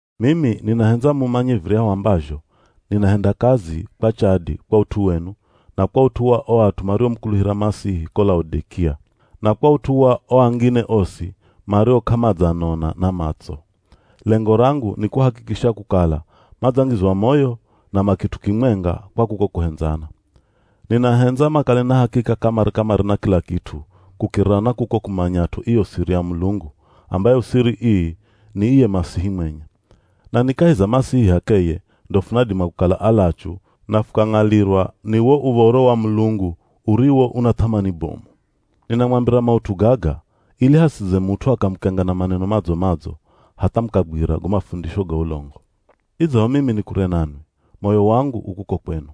Mimi ninahendza mumanye viryahu ambazho ninahenda kazi kwa chadi kwa ut'u wenu na kwa ut'u wa o at'u mariomukuluhira Masihi ko Laodikia, na kwa ut'u wa o angine osi mario k'amadzanona na matso. Lengo rangu ni kuhakikisha kukala madzangizwa moyo na ma kit'u kimwenga kwa kuko kuhendzana. Ninahendza makale na hakika kamare-kamare na kila kit'u kukirira na kuko kumanyat'o iyo siri ya Mulungu, ambayo siri ii ni iye Masihi mwenye. Na ni kahi za Masihi h'akeye ndo funadima kukala alachu na fukang'alirwa ni wo uv̱oro wa Mulungu uriwo una th'amani bomu. Ninamwambira maut'u gaga, ili hasidze mut'u akamukenga na maneno madzo-madzo hatha mukagwira go mafundisho ga ulongo. Idzaho mimi ni kure nanwi, moyo wangu u kuko kwenu.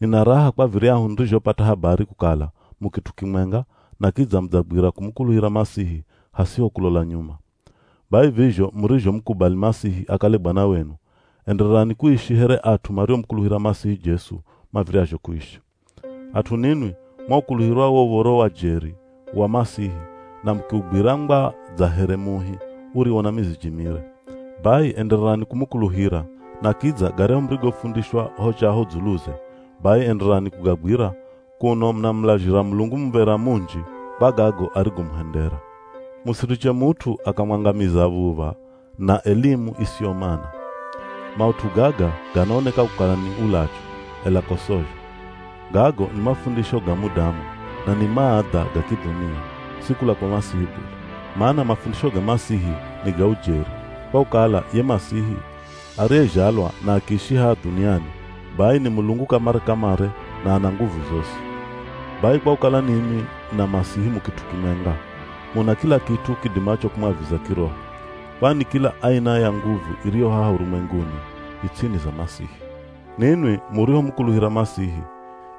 Nina raha kwa viryahu nirizhopata habari kukala mu kit'u kimwenga na kidza mudzagwira kumukuluhira Masihi hasiho kulola nyuma. Bai vizho murizhomukubali Masihi akale Bwana wenu, endererani kuishi here at'u mariomukuluhira Masihi Jesu mav̱iryazho kuishi. At'u ninwi mwaukuluhira wo uv̱oro wa jeri wa Masihi na mukiugwira ngwa dza here muhi uriwo na miziji mire. Bai endererani kumukuluhira na kidza garyahu murigofundishwa ho chaho dzuluze, bai endererani kugagwira kuno munamulazhira Mulungu muv̱era munji kwa gago arigomuhendera. Musiriche mut'u akamwangamiza v̱uv̱a na elimu isiyo mana. Maut'u gaga ganaoneka kukala ni ulachu, ela ko sozho. Gago ni mafundisho ga mudamu, na ni maadha ga kidhunia, si kula kwa Masihi bule. Mana mafundisho ga Masihi ni ga ujeri, kwa kukala ye Masihi ariyezhalwa na akiishi haha dhuniani bai ni Mulungu kamare-kamare na ana nguvu zosi. Bai kwa kukala ninwi na Masihi mu kit'u kimwenga, muna kila kit'u kidimacho kumwaviza kiroho. Kwani kila aina ya nguvu iriyo haha urumwenguni i ts'ini za Masihi. Ninwi murihomukuluhira Masihi,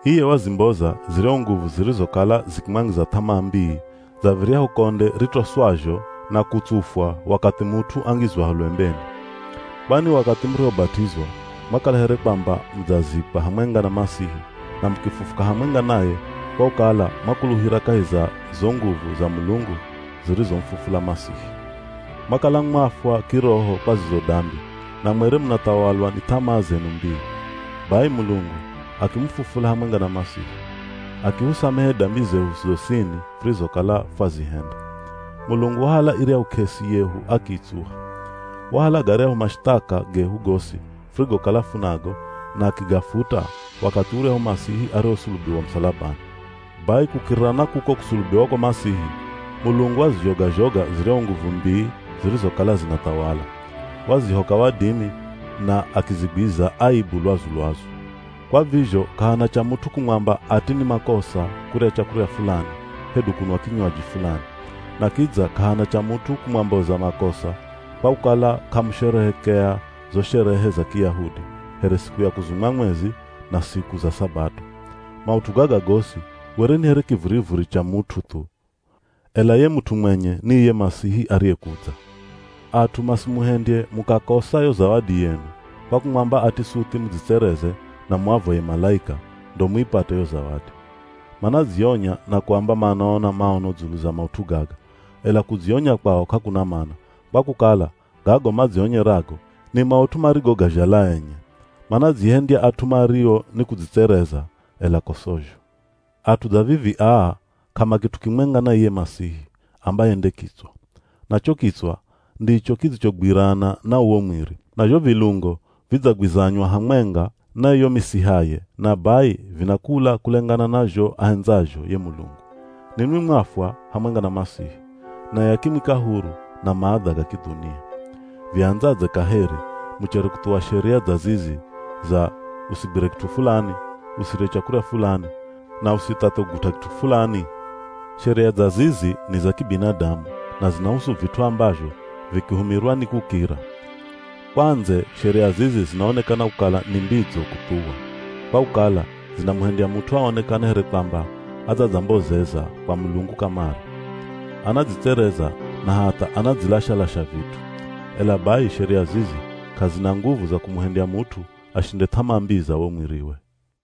iye wazimboza ziryahu nguvu zirizokala zikimwangiza th'amaa mbii dza viryahu konde ritoswazho na kutsufwa wakathi mut'u angizwaho lwembeni. Kwani wakathi murihobat'izwa mwakala here kwamba mudzazikwa hamwenga na Masihi na mukifufuka hamwenga naye kwa kukala mwakuluhira kahi za zo nguvu za Mulungu zirizomufufula Masihi. Mwakala mwafwa kiroho kwa zizo dambi, na mwere munathawalwa ni th'amaa zenu mbii. Bai Mulungu akimufufula hamwenga na Masihi. Akihusamehe dambi zehu zosini furizokala fwazihenda. Mulungu wahala iryahu k'esi yehu akiitsuha. Wahala garyahu mashithaka gehu gosi furigokala funago na akigafuta wakathi uryahu Masihi arihosulubiwa musalabani. Bai kukirira na kuko kusulubiwa kwa Masihi, Mulungu wazizhoga-zhoga ziryahu nguvu mbii zirizokala zinathawala. Wazihoka wadimi na akizigwiza aibu lwazu-lwazu. Kwa vizho k'ahana cha mut'u kumwamba ati ni makosa kurya chakurya fulani hedu kunwa kinywaji fulani. Na kidza k'ahana cha mut'u kumwamboza makosa kwa kukala k'amusherehekea zo sherehe za Kiyahudi, here siku ya kuzumwa mwezi na siku za sabato. Maut'u gaga gosi were ni here kivurivuri cha mut'u thu, ela ye mut'u mwenye ni iye Masihi ariyekudza. At'u masimuhendye mukakosa yo zawadi yenu kwa kumwamba ati suthi mudzitsereze na muavoye malaika ndo muipate yo zawadi. Manadzionya na kuamba maona maono dzulu za maut'u gaga. Ela kudzionya kwao k'akuna mana, kwa kukala gago madzionyerago ni maut'u marigogazhala enye. Manadzihendya at'u mario nikudzitsereza, ela ko sozho. At'u dza vivi aa k'amakit'u kimwenga na iye Masihi, ambaye nde kitswa. Na cho kitswa ndicho kidzichogwirana na uwo mwiri. Na zho vilungo vidzagwizanywa hamwenga na iyo misihaye na bai vinakula kulengana na zho ahendzazho ye Mulungu. Ninwi mwafwa hamwenga na Masihi, naye akimwika huru na maadha ga kidhunia. Viandzadze kaheri muchere kuthuwa sheria dza zizi za, “Usigwire kit'u fulani,” “Usirye chakurya fulani” na “Usithathe kugut'a kit'u fulani”? Sheria dza zizi ni za kibinadamu na zinahusu vit'u ambazho vikihumirwa nikukira. Kwa ndze sheria zizi zinaonekana kukala ni mbidzo kuthuwa, kwa kukala zinamuhendya mut'u aonekane here kwamba adzadzambozeza kwa Mulungu kamare. Anadzitsereza na hatha anadzilasha-lasha vit'u. Ela bai sheria zizi k'azina nguvu za kumuhendya mut'u ashinde th'amaa mbii za wo mwiriwe.